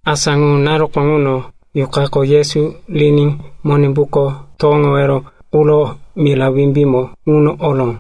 Asa ŋu naruko ŋuno Yuqako Yesu riní Monimbuko towoŋowero quro mira wimbímo ŋuno oró.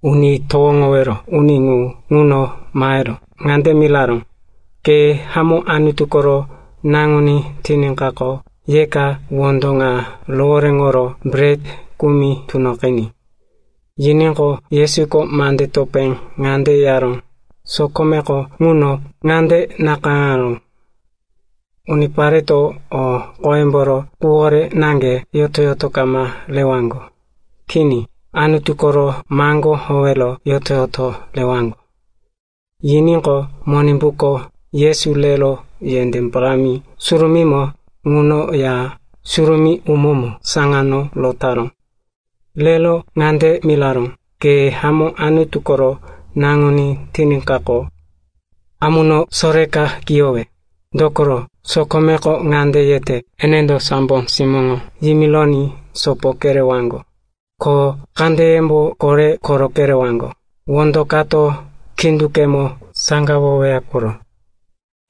Uni towoŋowero uni ŋu ŋuno mahero ŋande miraró, “Ke hamó Anutu koro Naŋuní tiníkaqo, yeka wondo ŋa rohoréŋoro bret kumi tunoqiní.” Yiníqo, Yesuko mande topé ŋande yaró, “Sokomeko ŋuno ŋande nakayáŋaró, ‘Unipareto o qoyemboro quwore naŋge yoto-yoto kama rewaŋgo. Kini. Anutu koro maŋgó howero yoto-yoto rewaŋgo.’” Yiníqo, Monimbuko Yesu rero yendé parámi surumímo ŋuno Ya Surumí umómo saŋano rotaró. Rero ŋande miraró, “Ke hamó Anutu koro Naŋuní tiníkaqo, amuno soreka kiyowe. Dokoro, sokomeko ŋande yete, “‘Enendo sambo simóŋo yimironí sopo kerewaŋgo, ko kandeyembo kore koro kerewaŋgo, wondo kato khíndoŋgemo saŋgawoweya koro.’”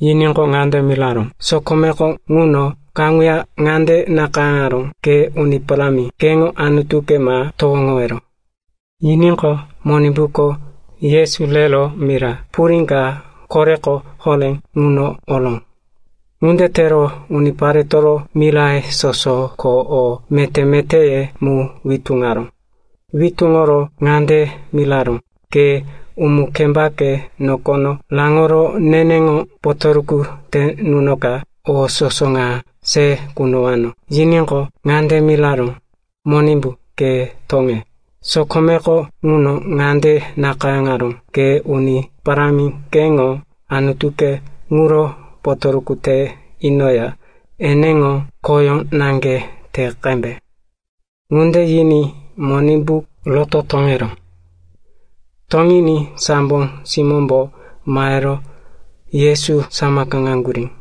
Yiníqo, ŋande miraró, “Sokomeko ŋuno kaŋuya ŋande nakayáŋaró, ‘Ke Uni Parámi, keŋo Anutuke ma towoŋowero.’” Yiníqo, Monimbuko Yesu rero mira purí ka koreko horé ŋuno oró. Ŋunde tero uniparetoro miraye soso ko o meté-metéye mu witúŋaró. Witúŋoro ŋande miraró, “Ke umu-kembake nokono raŋoro neneŋo potoruku te nunoka, o soso ŋa se kunowano.” Yiníqo, ŋande miraró, “Monimbu, ke toŋe. Sokomeko ŋuno ŋande nakayáŋaró, ‘Ke Uni Parámi, keŋo Anutuke ŋuro potoruku te inoya eneŋo khoyó naŋge te qembe.’” Ŋunde yiní Monimbu roto toŋeró. Toŋiní sambo simómbo mahero Yesu samakaŋaŋgurí.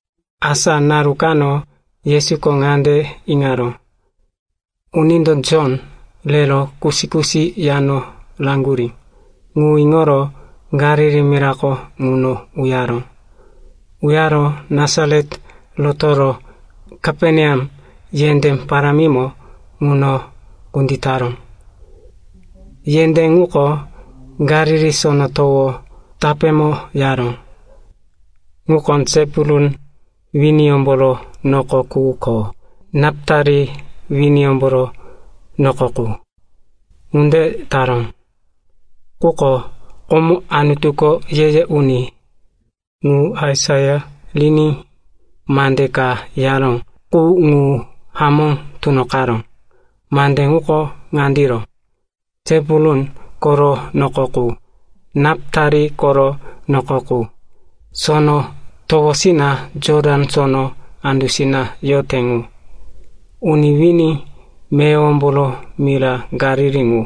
Asa naru kano Yesuko ŋande iŋaró, “Unindo Jon rero kusi-kusi yano raŋgurí,” ŋu iŋoro Galili mirako ŋuno uyaró. Uyaro Nasaret rotoro Kaperneam yendé parámimo ŋuno kunditaró. Yendé ŋuko Galili Sono Towo tapémo yaró, ŋuko Sepulun winiyómboro noko qu ko Napitali winiyómboro noko qu. Ŋunde taró, quko komo Anutuko ye-ye uni ŋu Aisaia riní mande ka yaró qu ŋu hamó tunoqaró. Mande ŋuko ŋandiro, “Sepulun koro noko qu, Napitali koro noko qu, sono towosina Jotan Sono andusina yote ŋu, uni wini meyowomboro mira Galili ŋu,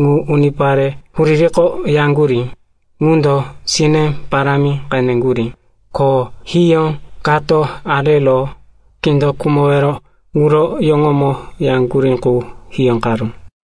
ŋu unipare huririko yaŋgurí ŋundo sine parámi qeneŋgurí, ko hiyó kato arero kindo khumowero quro yoŋoyómo yaŋgurí qu hiyóqaró.”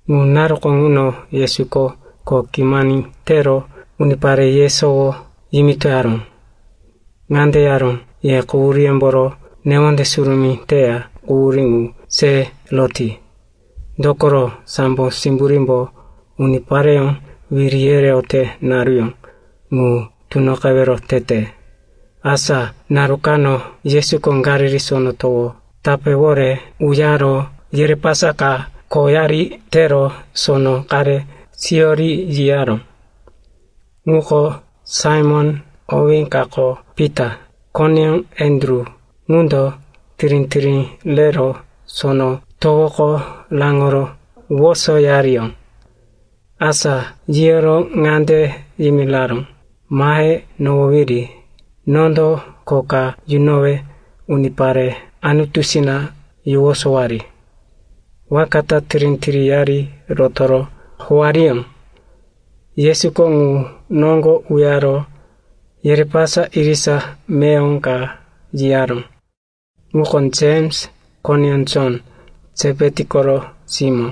Ŋu naruko ŋuno Yesuko kho kimani tero unipare yesowo yimitoyaró. Ŋande yaró, “Ye quhuríyemboro newonde surumí teya quhurí ŋu se roti. Dokoro sambo simburímbo unipareyó wiri yereyote naruyó ŋu tunoqewero tete.” Asa naru kano Yesuko Galili Sono Towo tapéwore uyaro yerepasa ka khoyari tero sono qare siyori yiyaró. Ŋuko Saimon (owí kako Pita), koneyó Andru. Ŋundo tirí-tirí rero sono towoko raŋoro wosoyariyó. Asa yiyoro ŋande yimiraró, “Mahe nohowiri. Nondo kho ka yunowe unipare Anutusina yowosowari.” Waka ta tirí-tiríyari rotoro howariyó. Yesuko ŋu noŋgo uyaro yerepasa irisa meyowo ka yiyaró. Ŋuko Jems, koneyó Jon, Sepeti koro simó.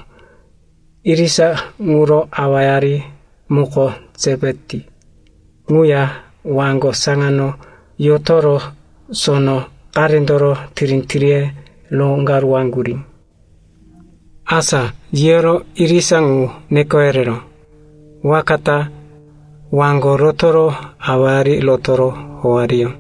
Irisa ŋuro awayari muko Sepeti ŋuya waŋgo saŋano yotoro sono qarendoro tirí-tiríye roŋgaruwaŋgurí. Asa yiyoro irisa ŋu neko yereró. Waka ta waŋgo rotoro awayari rotoro howariyó.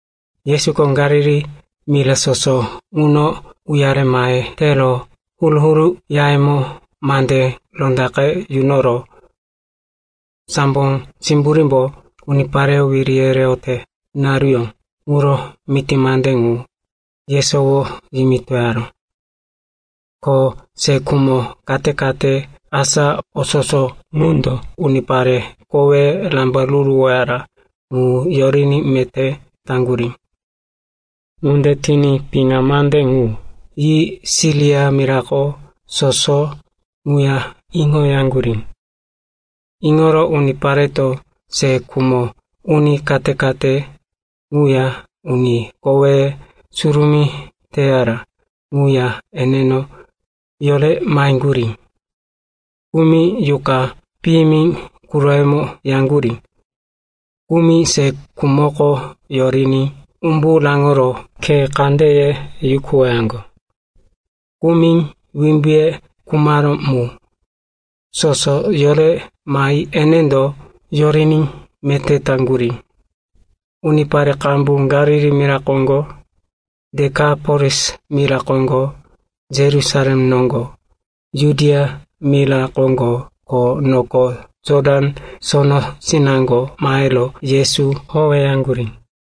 Yesuko Galili mira soso ŋuno uyare mahe tero huru-huru yayemo mande rondaqe yunoro sambo simburímbo unipareyó wiri yereyote naruyó ŋuro miti mande ŋu yesowo yimitoyaró. Ko se khumo kate-kate, asa o soso ŋundo unipare koweye rambaruruwaró ŋu yoriní meté taŋgurí. Ŋunde tiní piŋa mande ŋu yi Siria mira soso ŋuya iŋoyaŋgurí. Iŋoro unipareto se khumo uni kate-kate ŋuya uni koweye surumí teyara ŋuya eneno yore maheŋgurí. Kumi yuqa piyimi quroyemo yaŋgurí, kumi se khumoko yoriní umbu raŋoro khe kandeye yukuwoyaŋgo, kumi wimbuye khumaró ŋu. Soso yore mahi enendo yoriní meté taŋgurí. Unipare qambu Galili mira koŋgo, Dekapolis mira koŋgo, Yerusalem noŋgo, Judia mira koŋgo ko noko Jotan Sonosinaŋgo mahero Yesu howeyaŋgurí.